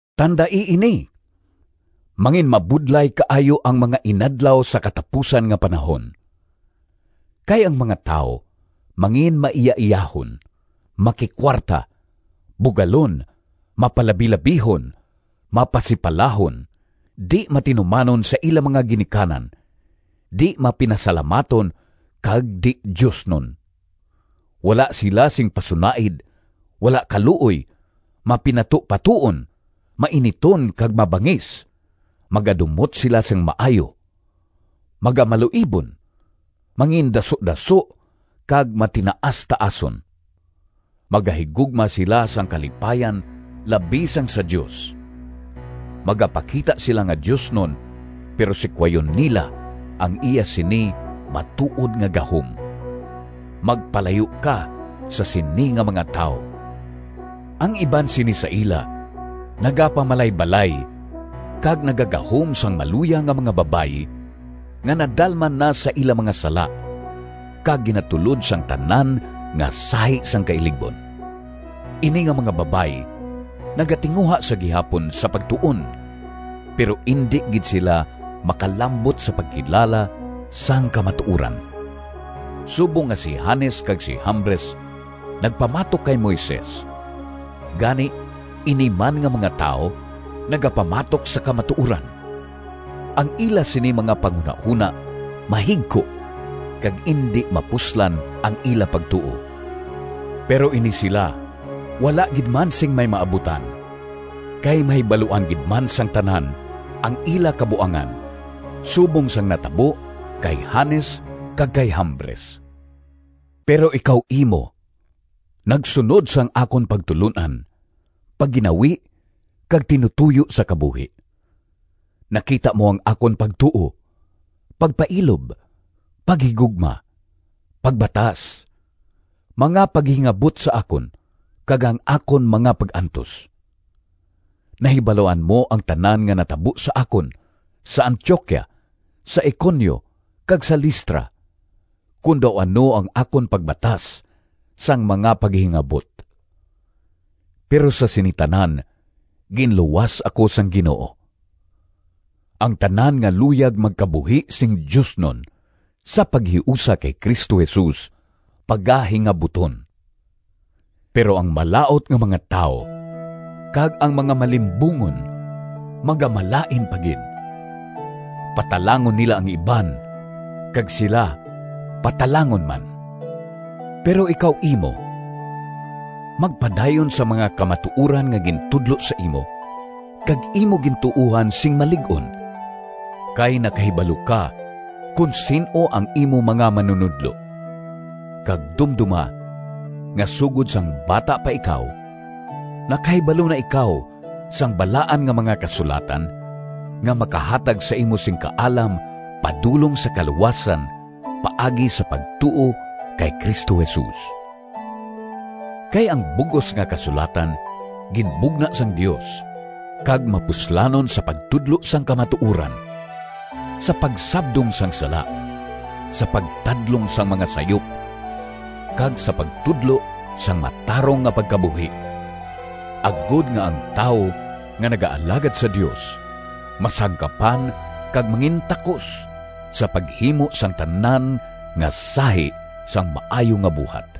Tandai ini! Manginmabudlay kaayo ang mga inadlaw sa katapusan nga panahon. Kay ang mga tawo manginmaiyaiyahon, makikuwarta, bugalon, mapalabilabihon, mapasipalahon, di-matinumanon sa ila mga ginikanan, di-mapinasalamaton kag di-diosnon; wala sila sing pasunaid, wala kaluoy, mapinatupatoon, mainiton kag mabangis; magadumot sila sang maayo, magamaluibon, mangindasudaso kag matinaastaason; magahigugma sila sang kalipayan labi sang sa Dios; magapakita sila nga diosnon, pero sikwayon nila ang iya sini matuod nga gahom. Magpalayo ka sa sini nga mga tawo. Ang iban sini sa ila nagapamalaybalay kag nagagahom sang maluya nga mga babayi nga nadalman na sa ila mga sala kag ginatulod sang tanan nga sahi sang kailigbon. Ini nga mga babayi nagatinguha sa gihapon sa pagtuon pero indi gid sila makalambot sa pagkilala sang kamatuoran. Subong nga si Jannes kag si Jambres nagpamatok kay Moises, gani ini man nga mga tawo nagapamatok sa kamatuoran. Ang ila sini mga panghunahona mahigko kag indi mapuslan ang ila pagtuo. Pero ini sila wala gid man sing may maabutan, kay mahibaluan gid man sang tanan ang ila kabuangan, subong sang natabo kay Jannes kag kay Jambres. Pero ikaw imo nagsunod sang akon pagtulon-an, pagginawi kag tinutoyo sa kabuhi; nakita mo ang akon pagtuo, pagpailob, paghigugma, pagbatas, mga paghingabot sa akon kag ang akon mga pag-antos. Nahibaluan mo ang tanan nga natabo sa akon sa Antioquia, sa Iconio kag sa Listra, kon daw ano ang akon pagbatas sang mga paghingabot! Pero sa sini tanan ginluwas ako sang Ginoo. Ang tanan nga luyag magkabuhi sing diosnon sa paghiusa kay Cristo Jesus pagahingabuton. Pero ang malaut nga mga tawo kag ang mga malimbungon magamalain pa gid. Patalangon nila ang iban kag sila patalangon man. Pero ikaw imo, magpadayon sa mga kamatuoran nga gintudlo sa imo kag imo ginatuohan sing malig-on. Kay nakahibalo ka kon sin-o ang imo mga manunodlo, kag dumdoma nga sugod sang bata pa ikaw, nakahibalo na ikaw sang Balaan nga mga Kasulatan, nga makahatag sa imo sing kaalam padulong sa kaluwasan paagi sa pagtuo kay Cristo Jesus. Kay ang bug-os nga Kasulatan ginbugna sang Dios kag mapuslanon sa pagtudlo sang kamatuoran, sa pagsabdong sang sala, sa pagtadlong sang mga sayop, kag sa pagtudlo sang matarong nga pagkabuhi, agod nga ang tawo nga nagaalagad sa Dios masangkapan kag mangintakos sa paghimo sang tanan nga sahi sang maayo nga buhat.